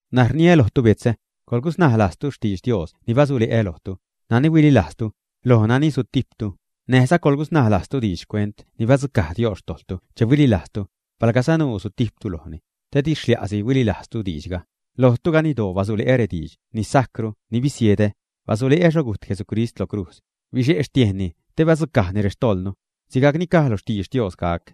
N̲aj rniä lojtu betzä, coḻgusnaj lajztu xtidx Dios ni basule'ä lojtu, nani huililajztu, loj nani sutijptu, näjza coḻgusnaj lajztu diidx xcuent ni badzucaj Dios xtojḻtu che huililajztu, palga sanuu sutijptu lojni, te di xlia'si huililajztu diidxga. Lojtu ganiddoo basule'ä rediidx ni sajcru ni bisiedä, basule'ä xho gujt Jesucrist lo crujz, bixe' xtiejnni te badzucajni rextojḻnu, sigajc ni caj lo xtidx Dios gac.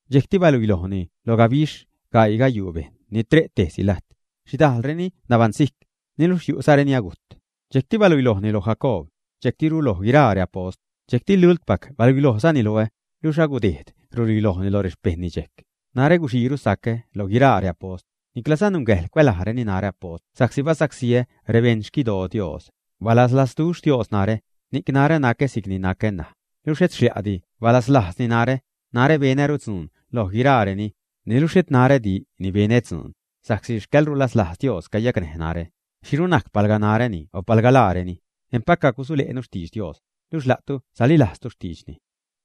dxejcti baluilojni lo gabixh gaii gayuu bejṉ ni tre' tejsi lajt. Xhidajlreni nabaṉsijc, niluxh yu'za reni agujt. Dxejcti baluilojni lo Jacoob, dxejctiru loj guiraa reapost. Dxejcti lultpac baluilojzani loä, luxh alagudejd ruluilojni lo rexpejṉni dxejc. Narä guxiiru sacä loj guiraa reapost, niclaza nungäjḻ cuälajreni narä apost sa'csi basacsíä rexpejṉ xquidoo Dios. Balaslazduxh Dios narä, ni'c narä nacä si'c ni nacä ṉaj. Luxh et xlia'di balaslajzni narä. Narä benäru dzuun loj guiraareni, niluxh xhet narädi ni benä dzuun, sa'csi xcäḻrulaslajz Dios cayacnäj narä. ¿Xhiru najcni palga naräni o palga laareni? Empac cagusule'nu xtidx Dios, luxh la'tu salilajztu xtiidxni.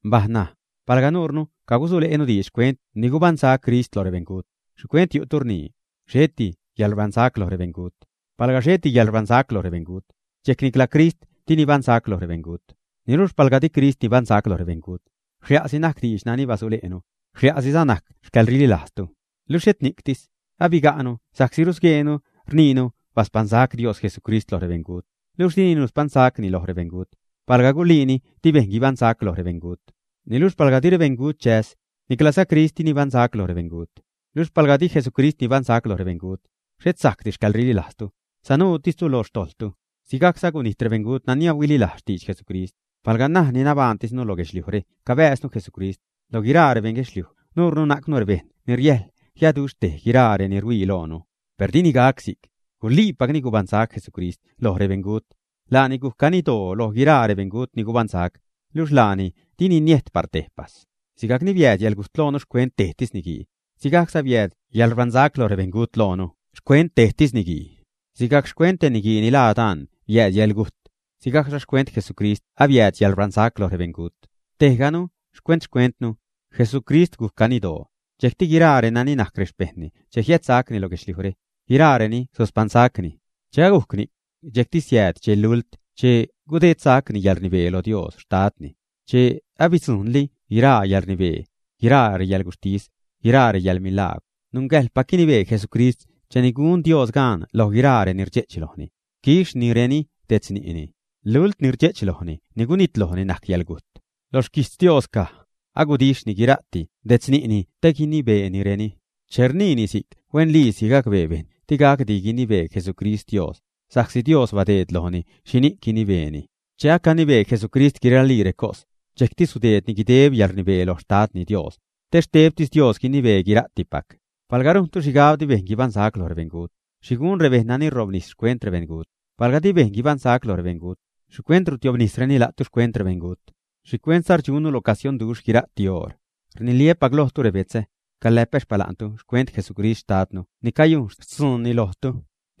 Mbaj ṉaj, palga nuurnu cagusule'nu diidx xcuent ni gubaṉsac Crist loj rebeṉgut, ¿xhicuent yu'tu ni rnii, xheti yäḻrbaṉsac loj rebeṉgut? Palga xheti yäḻrbaṉsac lo rebeṉgut, dxejc nicla Crist di nibaṉsac lo rebeṉgut. Luxh palga di Crist nibaṉsac loj rebeṉgut, ¡xlia'si najc diidx nani basule'nu! ¡Xlia'siza najc xcäḻrililajztu! Luxh et ni'ctis. Abiga'nu sa'csi rusgueenu rniinu baspaṉsac Dios Jesucrist loj rebeṉgut, luxh dini nuspaṉsacni loj rebeṉgut, palga guliini di bejṉ guibaṉsac loj rebeṉgut. Niluxh palga di rebeṉgut chäs, niclaza Crist di nibaṉsa'c lo rebeṉgut. Luxh palga di Jesucrist nibaṉsac loj rebeṉgut, xhet sajcdi xcäḻrililajztu, sanuutistu loj xtojḻtu. Sigajcza agunijt rebeṉgut nani huililajz xtidx Jesucrist. Palga ṉaj ni nabajṉtisnu loj guedxliujre cabääznu Jesucrist, lo guiraa rebeṉ guedxliuj nuurnu najcnu rebejṉ ni riäjl jiaduxhtej guiraa reni ruhuii loonu. ¡Per dini gac si'c! Guliipacni gubaṉsac Jesucrist loj rebeṉgut. Laani guc ganiddoo loj guiraa rebeṉgut ni gubaṉsac, luxh laani dini niejt par tejpas. Sigajcni biääd yäḻgujt loonu xcuent tejtis niguii, sigajcza biääd yäḻrbaṉsac lo rebeṉgut loonu xcuent tejtis niguii. Sigajc xcuent te niguii ni laa Adán biääd yäḻgujt, sigajcza xcuent Jesucrist biääd yäḻrbaṉsac loj rebeṉgut. Tejganu xcuent-xcuentnu; Jesucrist gujc ganiddoo, dxejcti guiraa reni najc rexpejṉni che jiädsacni lo guedxliujre, guiraareni suspaṉsacni. Che agujc ni'c, dxejcti siääd dxe lult che gudedsacni yäḻrnibee lo Dios Xtadni, che abadzujḻni guiraa reyäḻrnibee, guiraa reyäḻguxhtis, guiraa reyäḻmilagwr. Nungäjḻpac guinibee Jesucrist cheni gunli Dios gaan loj guiraa reni rdxe'ch lojni, quixhnireni detz ni'ni. Luḻt ni rdxe'ch lojni ni gunitlojni najc yäḻgujt. Lo xquijtz Dios caj: “Agudixhni guira'ti detz ni'ni te guinibeenireni.” Che rniini si'c huenliisi gacbee bejṉ di gacdi guinibee Jesucrist Dios, sa'csi Dios badeed lojni xhini'c guinibeeni. Che acanibee Jesucrist guiraali recos, dxejcti sudeedni guideb yäḻrnibee loj Xtadni Dios, te xtebtis Dios guinibee guira'tipac. Palga rujntu xhigab di bejṉ guibaṉsac loj rebeṉgut, ¿xhi gun rebejṉ nani robnis xcuent rebeṉgut? Palga di bejṉ guibaṉsac lo rebeṉgut, ¿xhicuent rutiobnisreni la'tu xcuent rebeṉgut? ¿Xhicuentza rdxunnu lo casionduxh guira'ti oṟ? Rniliä́pac lojtu, rebetzä, caläpä xpala'ntu xcuent Jesucrist Xtadnu ni cayun xtzuunni lojtu.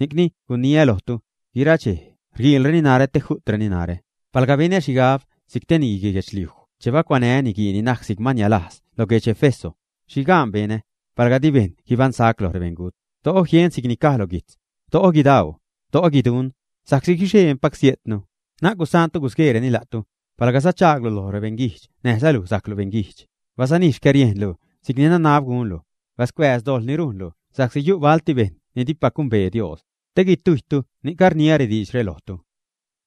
Ni'cni guniä lojtu, guira dxej rguiilreni narä te ju'treni narä. Palga benä xhigab si'c te niguii guedxliuj che bacuanää́ reniguii ni najc si'c man nialajz lo guedx Éfeso, ¿xhi gaan benä? Palga di bejṉ guibaṉsac loj rebeṉgut, do'o jien si'c ni caj lo guijtz: “Do'o guidau, do'o guiduṉ, sa'csi guixee empac sejtnu.” Na'c gusaantu gusgueereni la'tu, palga sachaaglu lo beṉguijdx näjza luj sajclu beṉguijdx. Basanij xcäriejnlu si'cni nanab gunlu. Bascuääz dojḻ ni rujnlu sa'csi yu' balti bejṉ ni dipac gumbee Dios. Te guitujytu ni'c rniä diidxre lojtu.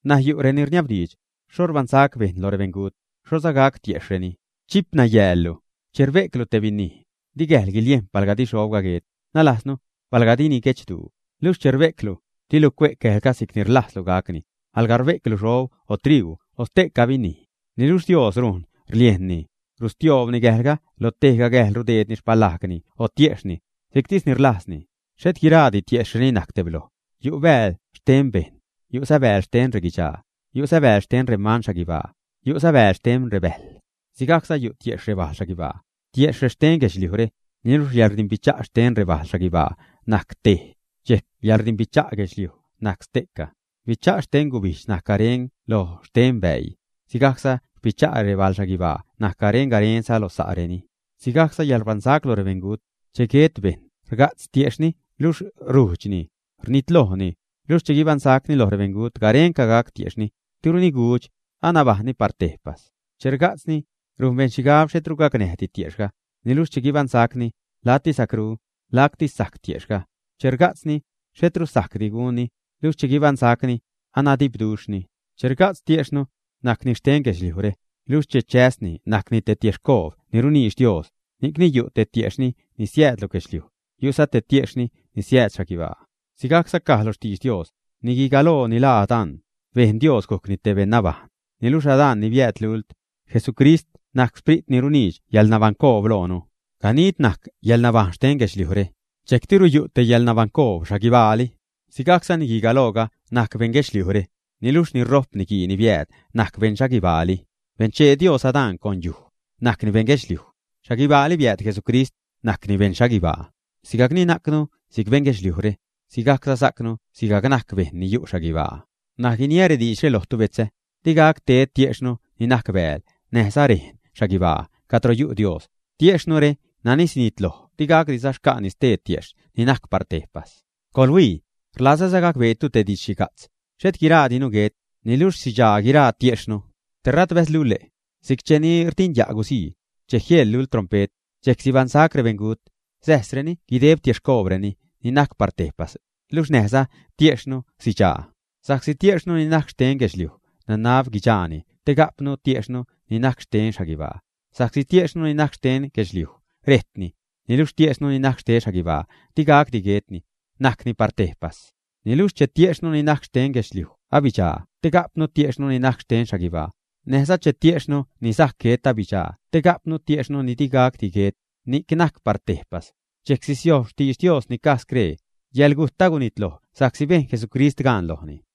N̲aj yu' reni rniabdiidx: “¿Xho rbaṉsac bejṉ loj rebeṉgut? ¿Xhoza gac tiejxhreni?” ¡Chip nayäällu! Che rbe'clu te binij, di gäjl guiliejn palga di xhobga guet, nalajznu, palga dini guechduu. Luxh che rbe'clu, dilu cue'c gäjlga si'cni rlajzlu gacni, alga rbe'clu xhob o triuu o ste'ca binij, niluxh Dios rujn rliejnni, rustioobni gäjlga, lo tejga gäjl rudeedni xpalajgni o tiejxhni, si'ctis ni rlajzni. Xhet guiraadi retiejxhreni najc tebloj. Yu' bääl xten bejṉ, yu'za bääl xten reguidxaa, yu'za bääl xten reman xhaguibaa, yu'za bääl xten rebäjl. Sigajcza yu' tiejxh rebajl xhaguibaa, tiejxh rexten guedxliujre. Niluxh yäḻrdimbicha' xten rebajl xhaguibaa najc tej, dxejc yäḻrdimbicha' guedxliuj najc ste'ca. Bicha' xte gubijdx najc garen lo xten bäii, sigajcza xpicha' rebal xhaguibaa najc garen-garenza lo sa'reni. Sigajcza yäḻrbaṉsac loj rebeṉgut; che guet bejṉ rga'tz tiejxhni luxh rujdxni, rnitlojni. Luxh che guibaṉsacni loj rebeṉgut, garenca gac tiejxhni, diruni gudx, anabajṉni par tejpas. Che rga'tzni, rujn bejṉ xhigab xhetru gacnäjdi tiejxhga, niluxh che guibaṉsacni, lacti sacru, lacti sajc tiejxhga. Che rga'tzni, xhetru sajcdi gunni, luxh che guibaṉsacni, anadipduxhni. Che rga'tz tiejxhnu, najcni xten guedxliujre, luxh che chäsni najcni te tiexhcoob ni runiidx Dios. Ni'cni yu' te tiejxhni ni siääd lo guedxliuj, yu'za te tiejxhni ni siääd xhaguibaa. Si'cza caj lo xtidx Dios: “Nigui galooga ni laa Adán, bejn Dios gujcni te beṉ nabajṉ.” Niluxh Adán ni biääd lult, Jesucrist najc Sprit ni runiidx yäḻnabaṉcoob loonu. Ganid najc yäḻnabajṉ xten guedxliujre, dxejctiru yu' te yäḻnabaṉcoob xhaguibaali. Sigajcza niguii galooga najc beṉ guedxliujre, niluxh ni rojp niguii ni biääd najc beṉ xhaguibaali. Benchee Dios Adán con yuj, najcni beṉ guedxliuj. Xhaguibaali biääd Jesucrist, najcni beṉ xhaguibaa. Sigajcni najcnu si'c beṉ guedxliujre, sigajcza sajcnu sigajc najc bejṉ ni yu' xhaguibaa. N̲aj guiniä rediidxre lojtu betzä, di gac ted tiejxhnu ni najc bääl näjza rejn xhaguibaa cadro yu' Dios. Tiejxhnure nani sinitloj di gacdiza xca'ni stee tiejxh ni najc par tejpas. ¡Coḻhuii! Rlazäza gacbeetu te didx-xhiga'tz; xhet guiraadinu guet, niluxh sidxaa guiraa retiejxhnu tera't bäzlule', si'c cheni rdinya' guzii, che jieḻ lult trompe't, dxejc sibaṉsac rebeṉgut, säjsreni guideb tiexhcoobreni ni najc par tejpas. Luxh näjza tiejxhnu sidxaa. Sa'csi tiejxhnu ni najc xten guedxliuj nanab guidxaani te ga'pnu tiejxhnu ni najc xten xhaguibaa, sa'csi tiejxhnu ni najc xten guedxliuj rejtni, niluxh tiejxhnu ni najc xten xhaguibaa di gacdi guetni, najcni par tejpas. Niluxh che tiejxhnu ni najc xten guedxliuj abidxaa te ga'pnu tiejxhnu ni najc xten xhaguibaa, näjza che tiejxhnu ni sajc guet abidxaa te ga'pnu tiejxhnu ni di gacdi guet, ni najc par tejpas, dxejc sisiojb xtidx Dios ni caj scree: “Yäḻgujt agunitloj sa'csi bejn Jesucrist gaan lojni.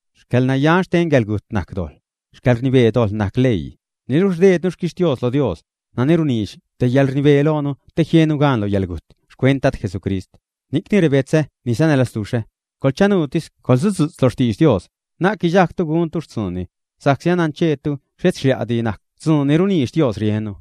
Xcäḻnayan xten yäḻgujt najc dojḻ. Xcäḻrnibee dojḻ najc leii. Niluxh rdeednu xquixtios lo Dios, nani runiidx te yäḻrnibee loonu te jiennu gaan lo yäḻgujt xcuent Dad Jesucrist. Ni'cni rebetzä ni sanälazduxhä, coḻchanuutis, coḻsudzu'tz lo xtidx Dios, na'c guidxajgtu guntu xtzuunni, sa'csi anancheetu xhet xlia'di najc dzuun ni runiidx Dios riennu.